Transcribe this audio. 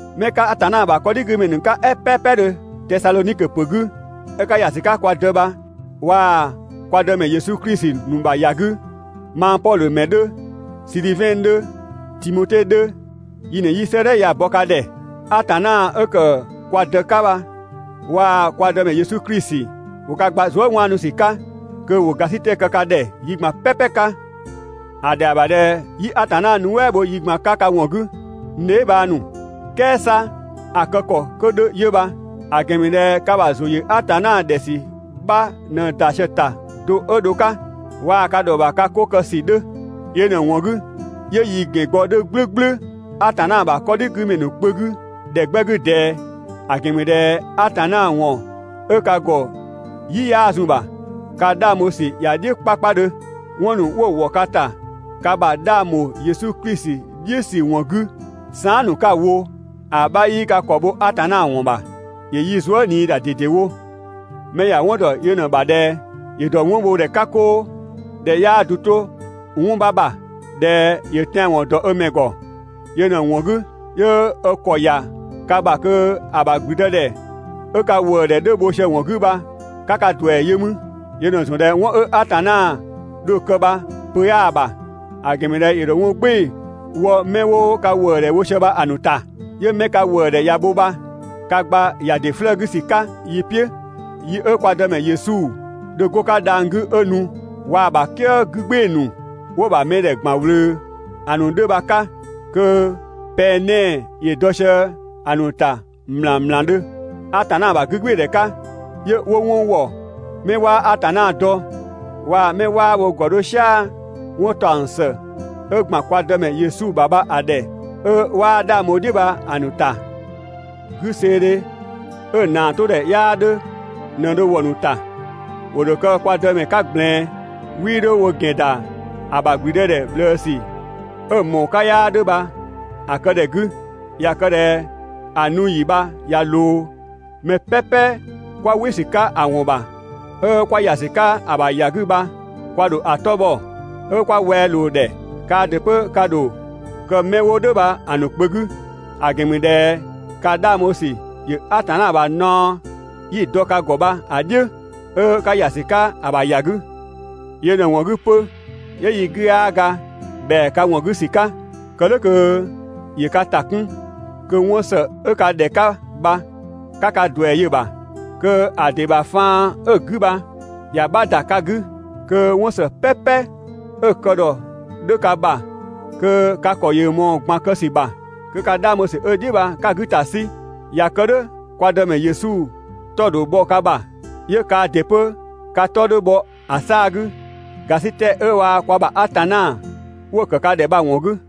'Mɛ 'ka Atanna ‑bha 'kɔdhigümɛ ‑nu 'ka "ɛ "pɛpɛdhö Tesadhonikö ‑pö 'gü, 'ö 'ka ‑ya ‑sü 'ka kwa Dë bha waa‑ kwa Dëmɛ Yesu Klisi ‑nu ‑bha ‑ya 'gü, mang Pɔdhö ‑mɛ 'dhö, Sidhivɛn 'dhö, Timote 'dhö, yi ꞊në 'yi 'sëëdhɛ ya‑ bɔ ka ‑dhɛ. Atanna 'ö ‑kë kwa Dë 'ka bha waa‑ kwa Dëmɛ Yesu Klisi, ‑wo ka gba zuëwaanusü 'ka, kö ‑wo ‑gasitɛ kë ka ‑dhɛ yi ꞊gban "pɛpɛ 'ka. ‑A ‑dhɛa ‑bha ꞊dhɛ 'yi Atanna nuɛ" bho yi ꞊gban 'ka ka ‑wɔn 'gü, n dheebhang ‑nu. "Kɛɛ 'sa ‑a kë ‑kɔ 'kö 'dhö 'yö bha, ‑a ‑gɛn ‑mü ꞊dhɛ ka ‑bha ‑zʋ ‑yö Atanna ‑dhɛ ‑sü 'bha ꞊në ‑da sië‑ ‑ta do 'ö dho‑ 'ka, waa‑ ka ‑dhɔ ‑bha ka 'ko kë ‑sü 'dhö. Yö ꞊në‑ ‑wɔn 'gü 'yö yi ‑gɛn gbɔ 'dhö "gblʋ̈gblʋ̈ Atanna ‑bha 'kɔdhigümɛ ‑nu kpö 'gü ‑dhɛ 'gbɛ 'gü ꞊dɛɛ, ‑a ‑gɛn ‑mü ꞊dhɛ Atanna ‑wɔn 'ö ka ‑gɔ "yi 'yaa zun‑ ‑bha, ka 'dhang bho ‑sü ‑ya "dhiʋ̈ 'kpakpadhö. 'Wɔn ‑nu 'wo‑ ‑wɔ ka ‑ta ka ‑bha 'dhang ‑bho Yesu Klisi "dhiʋ̈ ‑sü ‑wɔn 'gü, saan" ‑nu 'ka‑ wo, ‑a 'bha 'yii ka ‑kɔ bho Atanna ‑wɔn ‑bha. ‑Yö yi zuë" ꞊nii ‑da ꞊dedewo. Mɛ ‑ya 'wɔn ‑dɔ yö ꞊në‑ ‑bha ꞊dhɛ: ‑Yö ‑dɔ 'wɔn bho ‑dhɛ 'ka 'koo, ꞊dhɛ 'yaa du 'to 'wɔn 'bha ‑bha. ꞊Dhɛ ‑yö tɛanwɔn ‑dɔ ö ‑mɛ ‑gɔ. Yö ꞊në‑ ‑wɔn 'gü, 'yö ö ‑kɔ ‑ya ka ‑bha kö ‑a ‑bha ‑gblüdëdhɛ 'ö ka ‑wëëdhɛ 'dhö bho sië‑ ‑wɔn 'gü bha, 'ka ka ‑duɛ yö mü. Yö ꞊në‑ ‑zɔn ꞊dhɛ 'wɔn 'ö Atanna dho‑ kë bha pö 'yaa‑ ‑bha; ‑a ‑gɛn ‑mü ꞊dhɛ ‑yö ‑dho 'wɔn "gbɩɩ‑ wɔ 'mɛ 'wo ka ‑wëëdhɛ bho sië bha‑ ‑nu ‑ta. 'Yö 'mɛ ka ‑wëëdhɛ ꞊ya bho bha ka gba ‑ya ‑dɩ 'flëë‑ 'gü ‑sü 'ka yi "piʋ̈ yi 'ö kwa Dëmɛ Yesu dho 'go‑ 'ka dhang‑ 'gü 'ö nu, waa‑ ‑bha "kië 'gü "gbɩɩ‑ ‑nu 'wo‑ ‑bha mɛdhɛ ‑gban ꞊wlöö ‑a ‑nu 'dhö bha‑ 'ka, kö pɛng 'nɛɛ‑ ‑yö dɔ sië‑ ‑nu ‑ta ‑mlangmlangdhö (Atanna ‑bha 'gügbɩɩdhɛ 'ka), 'yö 'wo 'wɔn ‑wɔ 'mɛ 'waa Atanna dɔ, waa‑ 'mɛ 'waa wo ‑gɔ 'dho "sia‑ 'wɔn ‑taɔng ‑së 'ö ‑gban kwa Dëmɛ Yesu ‑bha bha‑ ‑dhɛ, 'ö 'waa 'dhang bho‑ "dhiʋ̈ bha‑ ‑nu ‑ta. 'Güseedhe 'ö‑ ‑naa 'to ‑dhɛ 'yaa 'dhö ꞊në dho wɔ‑ ‑nu ‑ta. ‑Wo ‑dho kë kwa Dëmɛ 'ka ꞊gblɛɛn, 'wii 'dho wo ‑gɛn ‑da ‑a ‑bha ‑gblüdëdhɛ ꞊bhlëësü 'ö‑ ꞊mɔɔ‑ 'ka 'yaa 'dhö bha‑ kë ‑dhɛ 'gü. ꞊Ya kë ꞊dhɛ ‑a nu ‑yi bha ꞊ya ꞊loo, mɛ "pɛpɛ 'kwa "wɩ ‑sü 'ka‑ ‑wɔn ‑bha 'ö 'kwa ‑ya ‑sü 'ka‑ ‑bha ‑ya 'gü bha, kwa ‑dho ‑a 'tɔ bhɔ, 'ö 'kwa wɛa ꞊loo‑ ‑dhɛ. Kaa ‑dɩ 'pö ka ‑dho kë 'mɛ 'wo "dhʋ̈ bha‑ ‑nu kpö 'gü, ‑a ‑gɛn ‑mü ꞊dhɛ ka 'dhang bho ‑sü ‑yö Atanna ‑bha naɔ 'yi‑ dɔ ka ‑gɔ bha‑ "dhiʋ̈, 'ö 'ka ‑ya ‑sü 'ka‑ ‑bha ‑ya 'gü. Yö ꞊në‑ ‑wɔn 'gü 'pö, 'yö yi 'gü 'yaa ga ‑bhɛa ka ‑wɔn 'gü ‑sü 'ka, kë "dhʋ̈ kö ‑yö ka ‑ta 'kun, kö 'wɔn ‑së 'ö ka ‑dhɛ 'ka bha 'ka ka ‑duɛ yö‑ ‑bha, kö‑ ‑dɩ ‑bha faan 'ö‑ 'gü bha, ‑ya 'bha ‑da ka 'gü, kö 'wɔn ‑së "pɛpɛ 'ö‑ kë ‑dhɔ 'dhö ka ‑bha kö ka ‑kɔ ‑yö ꞊mɔɔ‑ ꞊gban kë ‑sü ‑bha, kö ka 'dhang bho ‑sü 'ö‑ "dhiʋ̈ bha 'ka‑ 'gü ‑ta 'sü. ꞊Ya kë "dhʋ̈, kwa Dëmɛ Yesu 'tɔ‑ ‑dho bhɔ ka ‑bha, 'yö kaa ‑dɩ 'pö ka 'tɔ 'dhö bhɔ ‑a 'saa‑ 'gü, ‑gasitɛ 'ö waa‑ kwa ‑bha Atanna 'wo‑ ‑kë ka ‑dhɛ bha‑ ‑wɔn 'gü.